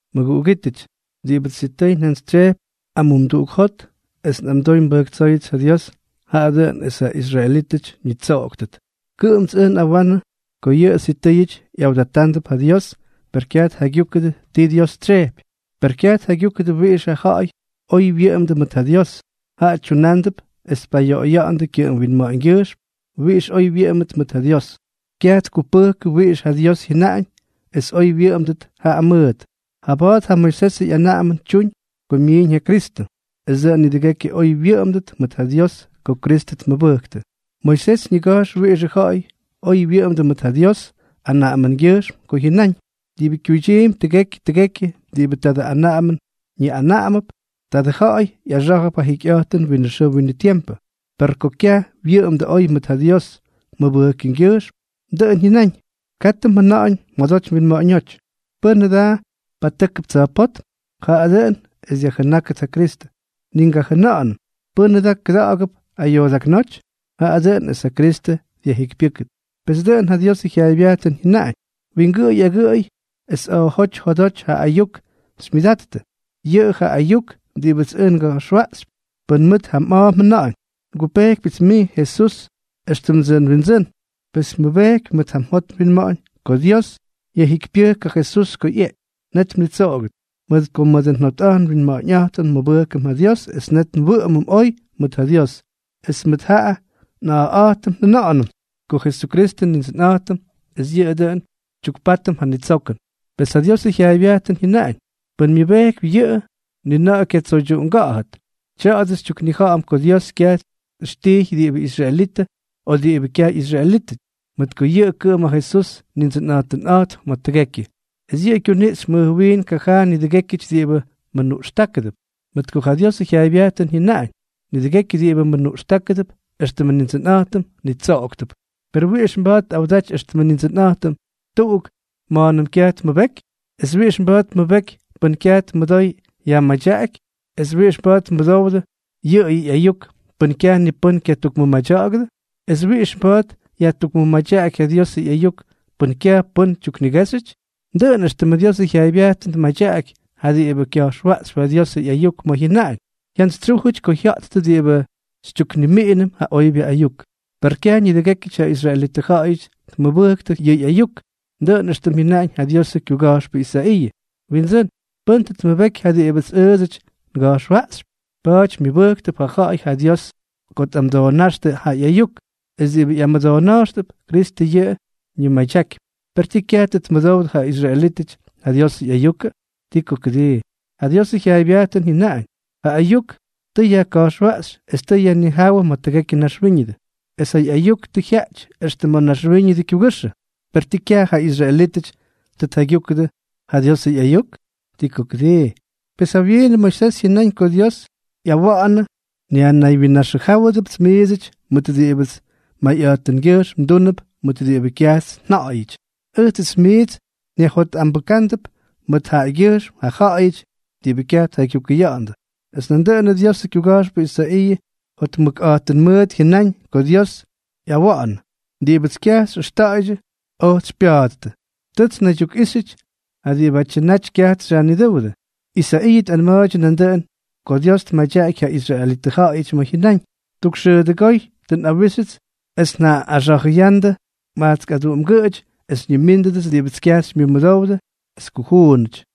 Mʉguꞌugítʉty, diꞌibʉts sitʉy njantsytsyejpy amumduꞌuk jot es nꞌamdoy nbʉjktsóyʉts ja Dios, jaꞌa dʉꞌʉn es ja israelítʉty ñitsoꞌoktʉt. Kʉꞌʉmts ʉj nꞌawanʉ ko yʉꞌʉ sitʉ́yʉty ꞌyawdatándʉp ja Dios, per kyaj tjaygyúkʉdʉ ti Dios tsyejpy. Pes kyaj tjaygyúkʉdʉ wiꞌixʉ ja̱ꞌa̱y oy wyʉꞌʉmdʉ mʉt ja Dios, jaꞌa tyunándʉp es tpayoꞌoya̱ꞌa̱ndʉ kyʉꞌʉm winma̱ꞌa̱ñgyʉjxm wiꞌix oy wyʉꞌʉmdʉt mʉt ja Dios, kyaj tkupʉktʉ wiꞌix ja Dios jyʉnaꞌañ es oy wyʉꞌʉmdʉt jaꞌa mʉʉt. Jaba̱a̱t ja Moisesʉ ꞌyanaꞌamʉn tyuuñ ko myiiñ ja Kristʉ, es dʉꞌʉn nidʉgekyʉ oy wyʉꞌʉmdʉt mʉt ja Dios ko Kristʉ tmʉbʉktʉ. Moisés ñiga̱jx wiꞌixʉ ja̱ꞌa̱y oy wyʉꞌʉmdʉ mʉt ja Dios anaꞌamʉngyʉjxm ko jyʉnáñ: “Diꞌibʉ kyuydyiimpy tʉgekyʉ tʉgekyʉ diꞌibʉ tadʉ anaꞌamʉn ñiꞌanaꞌamʉp, tadʉ ja̱ꞌa̱y ꞌyaxá̱jʉp ja jikyꞌa̱jtʉn winʉ xʉʉ winʉ tiempʉ.” Per ko ja̱ꞌa̱y wyʉꞌʉmdʉ oy mʉt ja Dios mʉbʉjkʉngyʉjxm, dʉꞌʉn jyʉnáñ: “Katʉ mjʉna̱ꞌa̱ñ mjodoty mwinma̱ꞌa̱ñóty: ¿Pʉ́nʉ da patʉ́kʉp tsa̱jpótm?” (Jaꞌa dʉꞌʉn es dyajjʉnákʉt ja Kristʉ.) Ni mgajʉna̱ꞌa̱nʉt: “¿Pʉ́nʉ da kʉda̱ꞌa̱gʉp ayoodaknóty?” (Jaꞌa dʉꞌʉn es ja Kristʉ dyajjikypyʉ́kʉt.) Pes dʉꞌʉn ja Diosʉ jyaaybyajtʉn jyʉnaꞌañ: “Wingʉꞌʉy agʉꞌʉy es a̱a̱jóty jodoty ja ayuk xymyʉdattʉ.” Yʉꞌʉ ja ayuk diꞌibʉts ʉj nga̱jxwaꞌxypy. Pʉn mʉt ja mꞌa̱a̱ mjʉna̱ꞌa̱ñ: “Ngupejkypyʉts mij, Jesús, éxtʉmdsʉ nWindsʉ́n”, es pʉn mmʉbejkypy mʉt ja mjot mwinma̱ꞌa̱ñ ko Dios yajjikypyʉjk ja Jesús ko ꞌyeꞌky, net mnitsoꞌogʉt. Mʉt ko mʉdʉ njotꞌa̱jt nwinma̱ꞌa̱ñꞌa̱jtʉm nmʉbʉjkʉm ja Dios es net nwʉꞌʉmʉm oy mʉt ja Dios, es mʉt ja nꞌa̱a̱ꞌa̱jtʉm njʉna̱ꞌa̱nʉm ko Jesukristʉ Nindsʉnꞌa̱jtʉm, es yʉꞌʉ dʉꞌʉn xytyukpátʉm ja nitsokʉn. Pes ja Diosʉ jyaaybyajtʉn jyʉnaꞌañ: “Pʉ́n myʉbejkypy yʉꞌʉ, ni na̱ꞌa̱ kyatsoydyuꞌunga̱ꞌa̱dʉt.” Tya̱a̱dʉ xytyuknija̱ꞌa̱m ko Dios kyaj tꞌijxkijxyʉ diꞌibʉ israelitʉ o diꞌibʉ kyaj ꞌyisraelítʉty, mʉt ko yʉꞌʉ kʉꞌʉm ja Jesús Nindsʉnꞌa̱jtʉnꞌa̱jtp ma̱ tʉgekyʉ, es yʉꞌʉ kyuniꞌxypy mʉj wiin kajaa nidʉgékyʉty diꞌibʉ mʉnuꞌxtákʉdʉp. Mʉt ko ja Diosʉ jyaaybyajtʉn jyʉnaꞌañ: “Nidʉgekyʉ diꞌibʉ mʉnuꞌxtákʉdʉp éxtʉmʉ Nindsʉnꞌa̱jtʉm, nitsoꞌoktʉp.” ¿Per wiꞌix mba̱a̱t tꞌawdaty éxtʉmʉ Nindsʉnꞌa̱jtʉm tuꞌuk ma̱a̱nʉm kyaj tmʉbeky? ¿Es wiꞌix mba̱a̱t tmʉbeky pʉn kyaj tmʉdoy yajmadyaꞌaky? ¿Es wiꞌix mba̱a̱t tmʉdowdʉ yʉꞌʉjʉ ꞌyayuk pʉn kyaj ni pʉ́n kyatukmʉmadya̱ꞌa̱gʉdʉ? ¿Es wiꞌix mba̱a̱t yajtukmʉmadyaꞌaky ja Diosʉ ꞌyayuk pʉn kyaj pʉ́n tyuknigéxyʉty? Dʉꞌʉn éxtʉmʉ Diosʉ jyaaybyajtʉn tmadyaꞌaky ja diꞌibʉ kya̱jxwa̱ꞌxtʉp ja Diosʉ ꞌyayuk ma̱ jyʉnaꞌañ: “¡Jyantsytsyújʉty ko jya̱ꞌttʉ diꞌibʉ xytyuknimiꞌinʉm ja oybyʉ ayuk!” Per kyaj nidʉgékyʉty ja israelitʉ ja̱ꞌa̱yʉty tmʉbʉktʉ yʉ ayuk, dʉꞌʉn éxtʉm jyʉnáñ ja Diosʉ kyuga̱jxpʉ Isaiiʉ: “Windsʉ́n, ¿pʉ́n tʉ tmʉbeky ja diꞌibʉts ʉʉdsʉty nga̱jxwaꞌxypy?” Pa̱a̱ty, myʉbʉjktʉp ja ja̱ꞌa̱y ja Dios ko tꞌamʉdoonáxtʉ ja ayuk, es diꞌibʉ ꞌyamʉdoona̱jxtʉp, Kristʉ yʉꞌʉ ñimadyakypy. ¿Per tii, kyaj tʉ tmʉdowdʉ ja israelítʉty ja Diosʉ ꞌyayukʉ? ¡Ti ko kʉdii! Ja Diosʉ jyaaybyajtʉn jyʉnaꞌañ: Ja ayuk tʉ yajka̱jxwaꞌxy es tʉ yajnijáwʉ ma̱ tʉgekyʉ naxwíñʉdʉ, es ja ꞌyayuk tʉ jyaꞌty extʉ ma̱ naxwíñʉdʉ kyugʉxʉ. ¿Per tii, kyaj ja israelítʉty tʉ tjaygyúkʉdʉ ja Diosʉ ꞌyayuk? ¡Ti ko kʉdii! Pes jawyiinʉ Moisés jyʉnáñ ko Dios ꞌyawa̱ꞌa̱nʉ: Nyajnaywyinnaxʉjáwʉdʉpts miidsʉty mʉt diꞌibʉts mayꞌa̱jtʉngyʉjxm ndúnʉp ma̱ diꞌibʉ kyajts nja̱ꞌa̱yʉty, ʉjtsʉts miits nyajjotꞌambʉ́ktʉp mʉt jaꞌagyʉjxm ja ja̱ꞌa̱yʉty diꞌibʉ kyaj tjaygyukʉya̱ꞌa̱ndʉ. Es nandʉꞌʉn Diosʉ kyuga̱jxpʉ Isaiiʉ jotmʉkꞌa̱jtʉn mʉt jyʉnáñ ko Dios yꞌawa̱ꞌa̱nʉ: Diꞌibʉts kyaj xyꞌʉxta̱a̱ydyʉ, ojts xypya̱a̱ttʉ; tʉts nnaydyukꞌíxyʉty ja diꞌibátyʉ naty kyajts xyajnidʉ́wʉdʉ. Isaiiʉ tꞌanma̱a̱ydyʉ nandʉꞌʉn ko Dios tmadyaky ja israelitʉ ja̱ꞌa̱yʉty ma̱ jyʉnáñ: “Tuk xʉʉdʉgóy tʉ nꞌawíxyʉts es tʉ njaꞌꞌaxa̱jʉya̱ꞌa̱ndʉ majtsk aduꞌumgʉꞌʉty es xyñimínʉdʉts diꞌibʉ kyajts xymyʉmʉdowdʉ es kujuunʉty.”